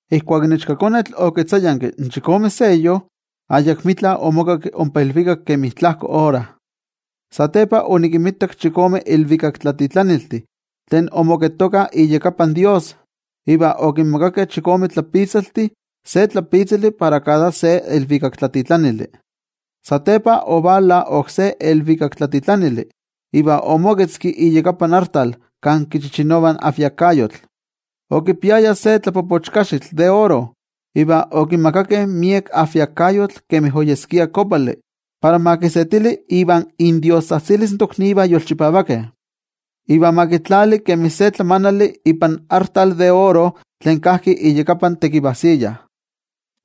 Ijkuak in Ichkakonetl okitzayanki in chikome seyo, ayakmitla omokakki ompa ilvikak kemi tlajko ora. Satepa onikinmitak chikome ilvikaktlatitlaniltih tlen omoketokah iyakapan toYejwatzi, iva okinmakakeh chikome tlapitzaltih, se tlapitzali para kada se ilvikaktlatitlanili. Satepa ovala oksé ilvikaktlatitlanili iva omoketzki iyakapan artal kan kichichinovah ajviakayotl. Okipiaya se tlapopochkaxitl de oro. Iva okimakakeh miek ajviakayotl kemi oyeskia kopali para ma kisetili ivan indiostzajtzilis in toknivah yolchipavakeh, iva ma kitlali kemi se tlamanali ipan artal de oro tlen kajki iyakapan tekivajsiya.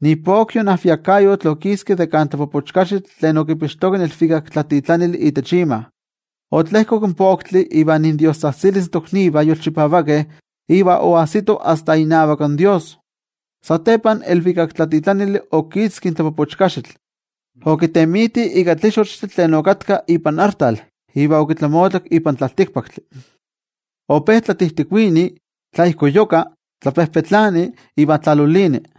Ipokyo in ajviakayotl okiski de kan tlapopochkaxitl tlen okipixtoka in ilvikaktlatitlanili itech ima, otlejkok in poktli iva indiostzajtzilis in toknivah yolchipavakeh iva oajsito asta inavak toYejwatzi. Satepa in ilvikaktlatitlanili okitzki in tlapopochkaxitl, okitemiti ika tlixochtli tlen okatka ipan artal iva okitlamotlak ipan tlaltikpaktli. Ope tlatijtikuini, tlaijkoyuka, tlapejpetlani iva tlalolini.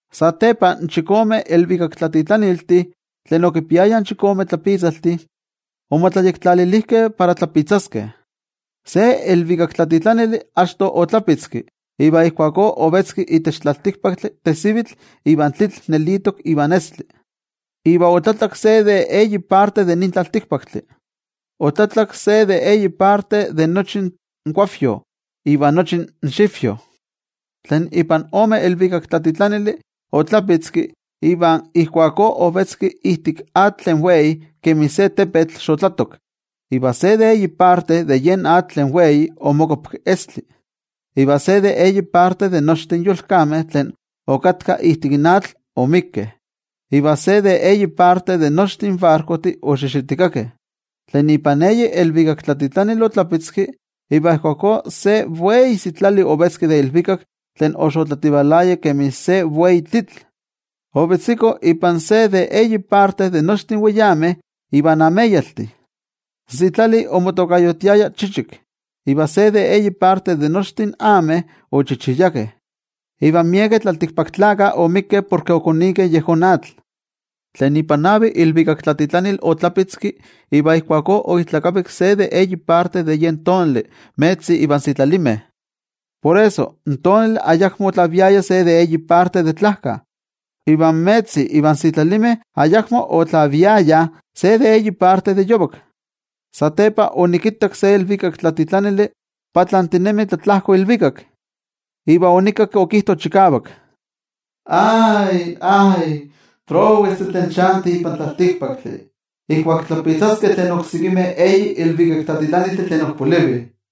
Satepa in chikome ilvikaktlatitlaniltih tlen okipiayah in chikome tlapitzaltih omotlayektlalilijkeh para tlapitzaskeh. Se ilvikaktlatitlanili achto otlapitzki, iva ijkuakó ovetzki itech tlaltikpaktli tesivitl iva tlitl nelitok ivan estli. Iva otlatlak se de eyi parte de nin tlaltikpaktli, otlatlak se de eyi parte de nochi in kuavyo iva nochi in xivyo. Tlen ipan ome ilvikaktlatitlanili otlapitzki, iva ijkuakó ovetzki ijtik atl tlen wei kemi se tepetl xotlatok. Iva se de eyi parte de yen atl tlen wei omokuapki estli. Iva se de eyi parte de nochtin in yolkameh tlen okatkah ijtik atl omikkeh, iva se de eyi parte de nochtin in barkojtih oxixitikakeh. Tlen ipan eyi ilvikaktlatitlanili otlapitzki, iva ijkuakó se wei sitlali ovetzki de ilvikak tlen oxotlativalaya kemi se wei tlitl. Ovetziko ipan se de eyi parte de nochtin weyameh ivan ameyaltih. In sitlali omotokayotiaya Chichik. Iva se de eyi parte de nochtin ameh ochichiyakeh, iva miekeh tlaltikpaktlakah omikkeh porke okonikeh yejón atl. Tlen ipan navi ilvikaktlatitlanili otlapitzki, iva ijkuakó oijtlakavik se de eyi parte in tonali, in metzi ivan sitlalimeh. Por eso, in tonali ayakmo otlaviaya se de eyi parte de tlajka, iva in metzi ivan sitlalimeh ayakmo otlaviayah se de eyi parte de yovak. Satepa onikittak se ilvikaktlatitlanili patlantinemi tlatlajko ilvikak, iva onikakki okijto chikavak: —¡Ay, ay! ¡Prowestih tlen chantih ipan tlaltikpaktli ijkuak tlapitzaskeh tlen oksekimeh eyi ilvikaktlatitlaniltih tlen ok polivih!